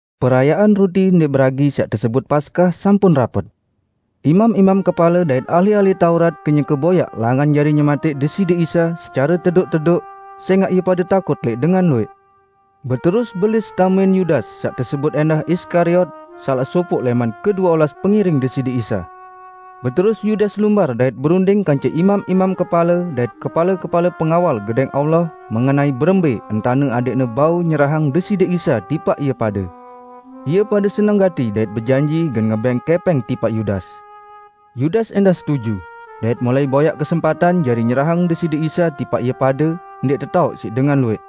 Perayaan Ruti Ndẽq Beragi saq tesebut Paskah sampun rapet. Imam-imam kepale dait ahli-ahli Taurat kenyeke boyaq langan jari nyematẽq Deside Isa secare tedoq-tedoq, sẽngaq ie pade takut lẽq dengan luwẽq. Beterus Belis tamein Yudas saq tesebut ẽndah Iskariot, salaq sopoq lẽman kedue olas pengiring Deside Isa. Beterus Yudas lumbar dait berunding kance imam-imam kepale dait kepale-kepale pengawal Gedẽng Allah mengenai berembẽ entane adẽqne bau nyerahang Deside Isa tipaq ie pade. Ie pade seneng gati dait bejanji gen ngebẽng kẽpẽng tipaq Yudas. Yudas ẽndah setuju, dait mulai boyaq kesempatan jari nyerahang Deside Isa tipaq ie pade ndẽq tetaoq siq dengan luwẽq.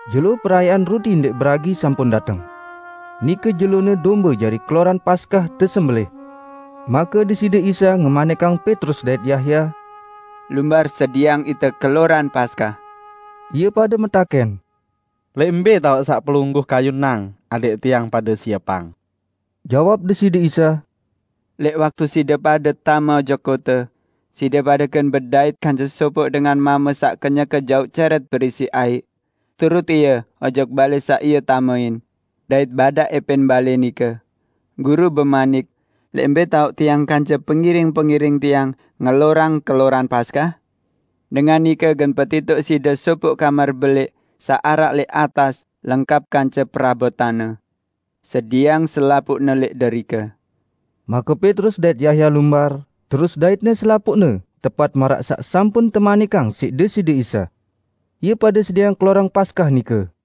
Jelo Perayaan Ruti Ndẽq Beragi sampun dateng. Nike jelone dombe jari keloran Paskah tesembelẽh. Make Deside Isa ngemanikang Petrus dait Yahya, "Lumbar sedieang ite keloran Paskah." Ie pade metakẽn, "Lẽq mbẽ taoq saq Pelungguh kayunang adẽq tiang pade siepang?" Jawab Deside Isa, "Lẽq waktu side pade tame ojok kote, side pade gen bedait kance sopoq dengan mame saq kenyeke jauq cẽrẽt berisi aiq. Turut ie ojok balẽ saq ie tamein, dait badaq ẽpẽn balẽ nike: Guru bemanik, 'Lẽq mbẽ taoq Tiang kance pengiring-pengiring Tiang ngelorang keloran Paskah?' Dengan nike gen petitoq side sopoq kamar belẽq saq araq lẽq atas lengkap kance perabotanne. Sidieang selapuqne lẽq derike." Make Petrus dait Yahya lumbar, terus daitne selapuqne tepat maraq saq sampun temanikang siq Deside Isa. Ie pade sedieang keloran Paskah nike.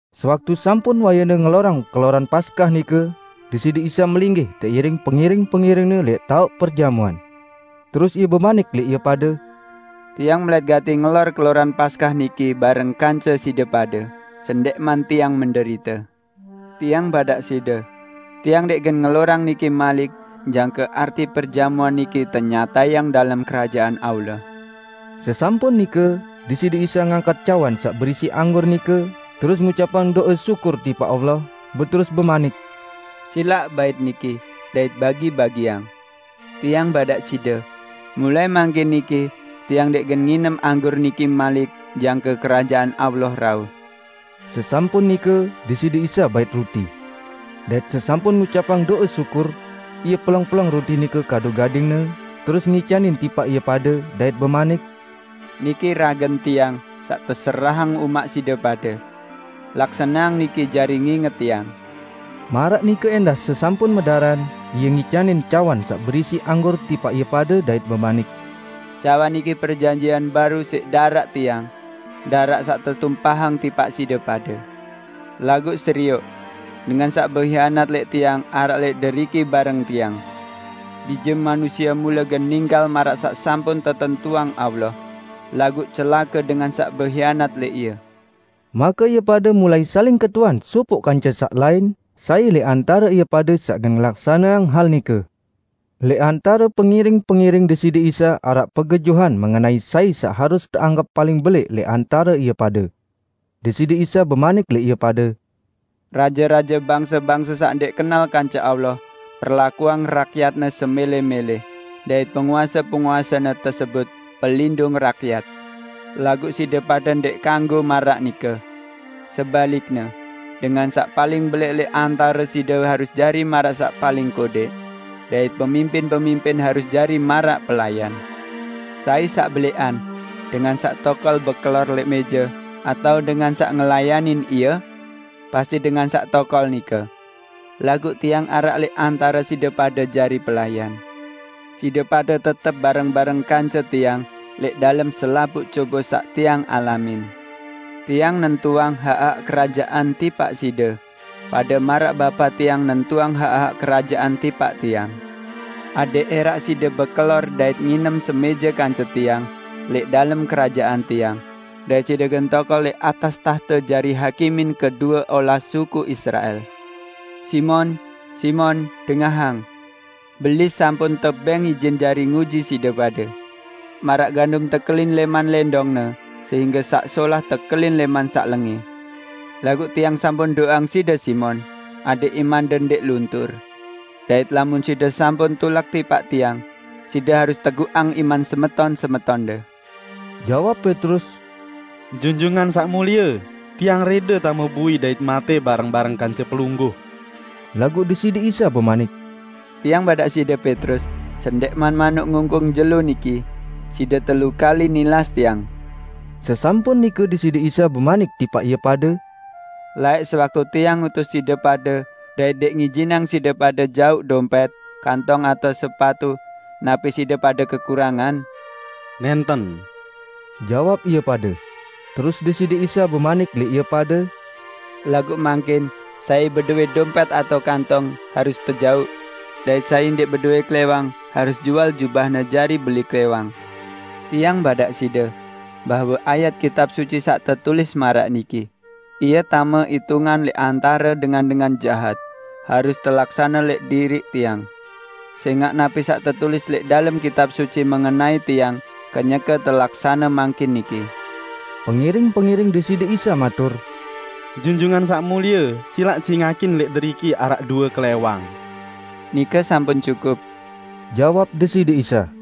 Sewaktu sampun wayene ngelorang keloran Paskah nike, Deside Isa melinggih teiring pengiring-pengiring-Ne lẽq taoq perjamuan. Terus Ie bemanik lẽq ie pade, "Tiang melẽt gati ngelor keloran Paskah niki bareng kance side pade, sendẽqman Tiang menderite! Tiang badaq side: Tiang ndẽq gen ngelorang niki malik jangke arti perjamuan niki tenyatayang dalem Kerajaan Allah." Sesampun nike, Deside Isa ngangkat cawan saq berisi anggur nike, terus ngucapang do'e syukur tipaq Allah, beterus bemanik, "Silaq bait niki, dait bagi-bagiang; Tiang badaq side: Mulai mangkin niki Tiang ndẽq gen nginem anggur niki malik jangke Kerajaan Allah rauh." Sesampun nike, Deside Isa bait ruti. Dait sesampun ngucapang do'e syukur, Ie peleng-peleng ruti nike kadu gading-Ne, terus ngicanin tipaq ie pade, dait bemanik, "Niki ragen Tiang saq teserahang umaq side pade. Laksaneang niki jari nginget Tiang." Maraq nike ẽndah sesampun medaran, Ie ngicanin cawan saq berisi anggur tipaq ie pade dait bemanik, "Cawan niki perjanjian baru siq daraq Tiang, daraq saq tetumpahang tipaq side pade." "Laguq serioq! Dengan saq behianat lẽq Tiang araq lẽq deriki bareng Tiang! Bije Manusie mule gen ninggal maraq saq sampun tetentuang Allah; laguq celake dengan saq behianat lẽq Ie!" Make ie pade mulai saling ketuan sopoq kance saq lain, sai lẽq antare ie pade saq gen ngelaksaneang hal nike. Lẽq antare pengiring-pengiring Deside Isa araq pegejuhan mengenai sai saq harus teanggep paling belẽq lẽq antare ie pade. Deside Isa bemanik lẽq ie pade, "Raje-raje bangse-bangse saq ndẽq kenal kance Allah perlakuang rakyatne semẽlẽ-mẽlẽ dait penguase-penguasene tesebut 'Pelindung Rakyat'. Laguq side pade ndẽq kanggo maraq nike. Sebalikne, dengan saq paling belẽq lẽq antare side harus jari maraq saq paling kodẽq, dait pemimpin-pemimpin harus jari maraq pelayan. Sai saq belẽqan: Dengan saq tokol bekelor lẽq mẽje, atao dengan saq ngelayanin ie? Pasti dengan saq tokol nike. Laguq Tiang araq lẽq antare side pade jari pelayan. Side pade tetep bareng-bareng kance Tiang lẽq dalem selapuq cobe saq Tiang alamin. Tiang nentuang hak-hak Kerajaan tipaq side, pade maraq Bapa Tiang nentuang hak-hak Kerajaan tipaq Tiang, adẽq ẽraq side bekelor dait nginem semẽje kance Tiang lẽq dalem Kerajaan Tiang dait side gen tokol lẽq atas tahte jari hakimin kedue olas suku Israel." "Simon, Simon, dengahang! Belis sampun tebẽng ijin jari nguji side pade; maraq gandum tekelin lẽman lẽndongne sehingge saq solah tekelin lẽman saq lengẽ. Laguq Tiang sampun do'eang side, Simon, adẽq imande ndẽq luntur. Dait lamun side sampun tulak tipaq Tiang, side harus teguqang iman semeton-semetonde." Jawab Petrus, "Junjungan Saq Mulie, tiang rẽde tame bui dait matẽ bareng-bareng kance Pelungguh!" Laguq Deside Isa bemanik, "Tiang badaq side, Petrus, sendẽqman manuk ngungkung jelo niki, side telu kali nilas Tiang." Sesampun nike Deside Isa bemanik tipaq ie pade, "Laẽq sewaktu Tiang ngutus side pade dait ndẽq ngijinang side pade jauq dompẽt, kantong atao sepatu, napi side pade kekurangan?" "Nẽnten!" jawab ie pade. Terus Deside Isa bemanik lẽq ie pade, "Laguq mangkin, sai bedowẽ dompẽt atao kantong, harus tejauq; dait sai ndẽq bedowẽ klẽwang, harus jual jubahne jari beli klẽwang. Tiang badaq side, bahwe ayat Kitab Suci saq tetulis maraq niki, 'Ie tame itungan lẽq antare dengan-dengan jahat,' harus telaksane lẽq diriq Tiang. Sẽngaq napi saq tetulis lẽq dalem Kitab Suci mengenai Tiang kenyeke telaksane mangkin niki." Pengiring-pengiring Deside Isa matur, "Junjungan Saq Mulie silaq cingakin, lẽq deriki araq due klẽwang." "Nike sampun cukup!" jawab Deside Isa.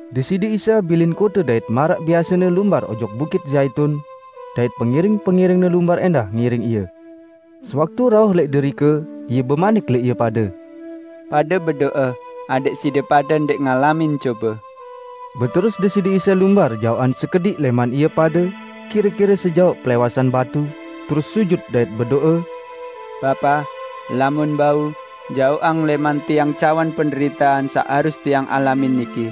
Deside Isa bilin kote dait maraq biasene lumbar ojok Bukit Zaitun, dait pengiring-pengiring-Ne lumbar ẽndah ngiring Ie. Sewaktu rauh lẽq derike, Ie bemanik lẽq ie pade, "Pade bedo'e adẽq side pade ndẽq ngalamin cobe." Beterus Deside Isa lumbar jaoqan sekediq lẽman ie pade, kire-kire sejaoq pelẽwasan batu, terus sujut dait bedo'e, "Bapa, lamun bau, jaoqang lẽman Tiang cawan penderitean saq harus Tiang alamin niki.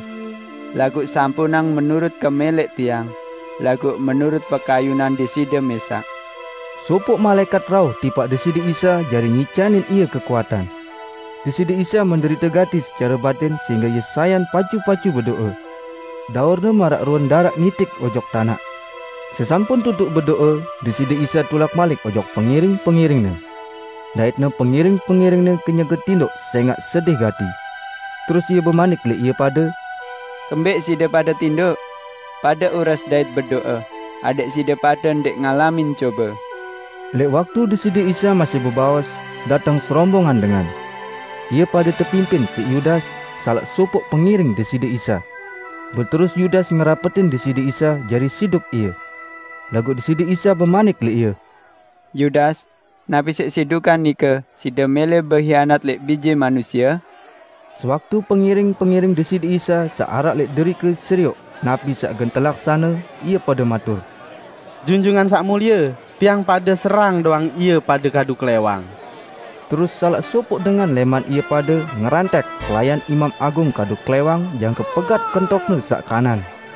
Laguq sampunang menurut kemẽlẽq Tiang, laguq menurut pekayunan Deside mẽsaq." [ Sopoq malaẽkat rauh tipaq Deside Isa jari ngicanin Ie kekuatan. Deside Isa menderite gati secare batin sehingge Ie sayan pacu-pacu bedo'e. Daur-Ne maraq ruen daraq ngitik ojok tanaq.] Sesampun tutuq bedo'e, Deside Isa tulak malik ojok pengiring-pengiring-Ne. Dait-Ne pengiring-pengiring-Ne kenyeke tindoq sẽngaq sedih gati. Terus Ie bemanik lẽq ie pade, "Kembẽq side pade tindoq? Pade ures dait bedo'e adẽq side pade ndẽq ngalamin cobe." Lẽq waktu Deside Isa masih bebaos, dateng serombongan dengan. Ie pade tepimpin siq Yudas, salaq sopoq pengiring Deside Isa. Beterus Yudas ngerapetin Deside Isa jari siduk Ie. Laguq Deside Isa bemanik lẽq ie, "Yudas, napi siq sidukan nike side mẽlẽ behianat lẽq Bije Manusie?" Sewaktu pengiring-pengiring Deside Isa saq araq lẽq derike serioq napi saq gen telaksane, ie pade matur, "Junjungan Saq Mulie, tiang pade serang doang ie pade kadu klẽwang!" Terus salaq sopoq dengan lẽman ie pade ngerantek pelayan Imam Agung kadu klẽwang jangke pegat kentokne saq kanan.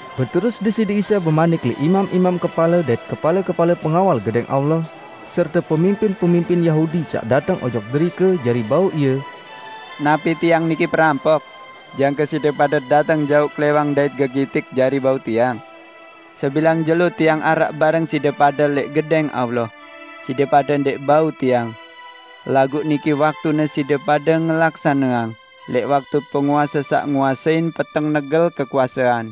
Beterus Deside Isa bemanik lẽq imam-imam kepale dait kepale-kepale pengawal Gedẽng Allah, serte pemimpin-pemimpin Yahudi saq dateng ojok derike jari bau Ie, "Napi Tiang niki perampok, jangke side pade dateng jauq klẽwang dait gegitik jari bau Tiang? Sebilang jelo Tiang araq bareng side pade lẽq Gedẽng Allah, side pade ndẽq bau Tiang. Laguq niki waktune side pade ngelaksaneang, lẽq waktu penguase saq nguasein peteng negel kekuasean."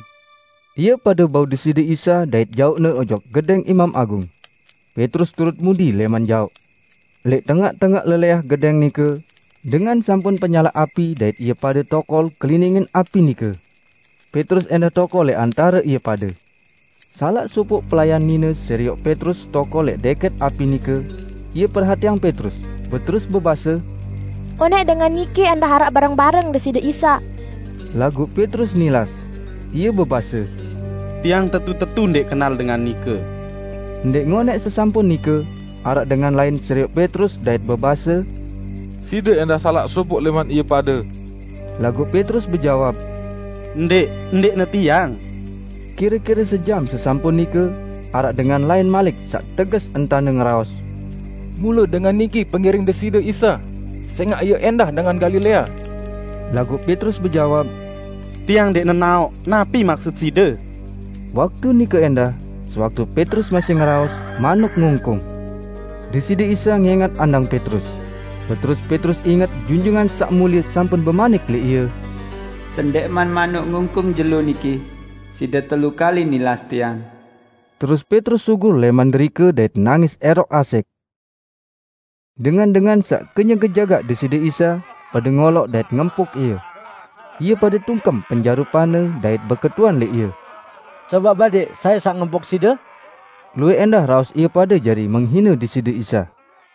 Ie pade bau Deside Isa dait jauqne ojok gedẽng Imam Agung. Petrus turut mudi lẽman jaoq. Lẽq tengaq-tengaq lelẽah gedẽng nike, dengan sampun penyalaq api dait ie pade tokol keliningin api nike. Petrus ẽndah tokol lẽq antare ie pade. Salaq sopoq pelayan nine serioq Petrus tokol lẽq dẽkẽt api nike; ie perhatiang Petrus, beterus bebase, "Onẽq dengan niki ẽndah araq bareng-bareng Deside Isa!" Laguq Petrus nilas. Ie bebase, "Tiang tetu-tetu ndẽq kenal dengan nike!" Ndẽq ngonẽq sesampun nike, araq dengan lain serioq Petrus dait bebase, "Side ẽndah salaq sopoq lẽman ie pade!" Laguq Petrus bejawab, "Ndẽq, ndẽqne tiang!" Kire-kire sejam sesampun nike, araq dengan lain malik saq teges entane ngeraos, "Mule dengan niki pengiring Deside Isa, sẽngaq ie ẽndah dengan Galilea!" Laguq Petrus bejawab, "Tiang ndẽq nenaoq, napi maksut side!" Waktu nike ẽndah, sewaktu Petrus masih ngeraos, manuk ngungkung. Deside Isa ngẽngat andang Petrus. Beterus Petrus inget Junjungan Saq Mulie sampun bemanik lẽq ie, "Sendẽqman manuk ngungkung jelo niki, side telu kali nilas Tiang." Terus Petrus sugul lẽman derike dait nangis ẽroq asẽq. Dengan-dengan saq kenyeke jagaq Deside Isa, pade ngoloq dait ngempuk Ie. Ie pade tungkem penjarupan-Ne dait beketuan lẽq Ie, "Cobaq badẽq sai saq ngempuk Side?" Luwẽq ẽndah raos ie pade jari menghine Deside Isa.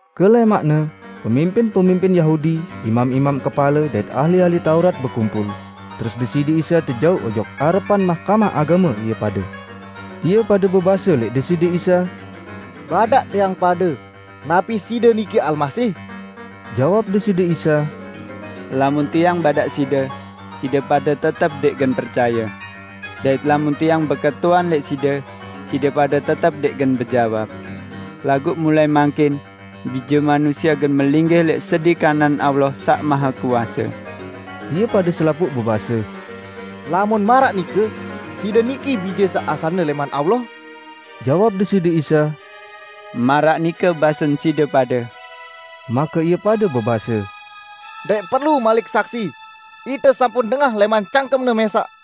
Kelẽmaqne, pemimpin-pemimpin Yahudi, imam-imam kepale, dait ahli-ahli Taurat bekumpul, terus Deside Isa tejauq ojok arepan Mahkamah Agame ie pade. Ie pade bebase lẽq Deside Isa, "Badaq tiang pade, napi Side niki Almasih?" Jawab Deside Isa, "Lamun Tiang badaq side, side pade tetep ndẽq gen percaye. Dait lamun Tiang beketuan lẽq side, side pade tetep ndẽq gen bejawab. Laguq mulai mangkin, Bije Manusie gen melinggih lẽq sedi kanan Allah Saq Mahekuase." Ie pade selapuq bebase, "Lamun maraq nike, Side niki Bije saq asalne lẽman Allah?" Jawab Deside Isa, "Maraq nike basen side pade." Make ie pade bebase, "Ndẽq perlu malik saksi! Ite sampun dengah lẽman cangkem-Ne mẽsaq!"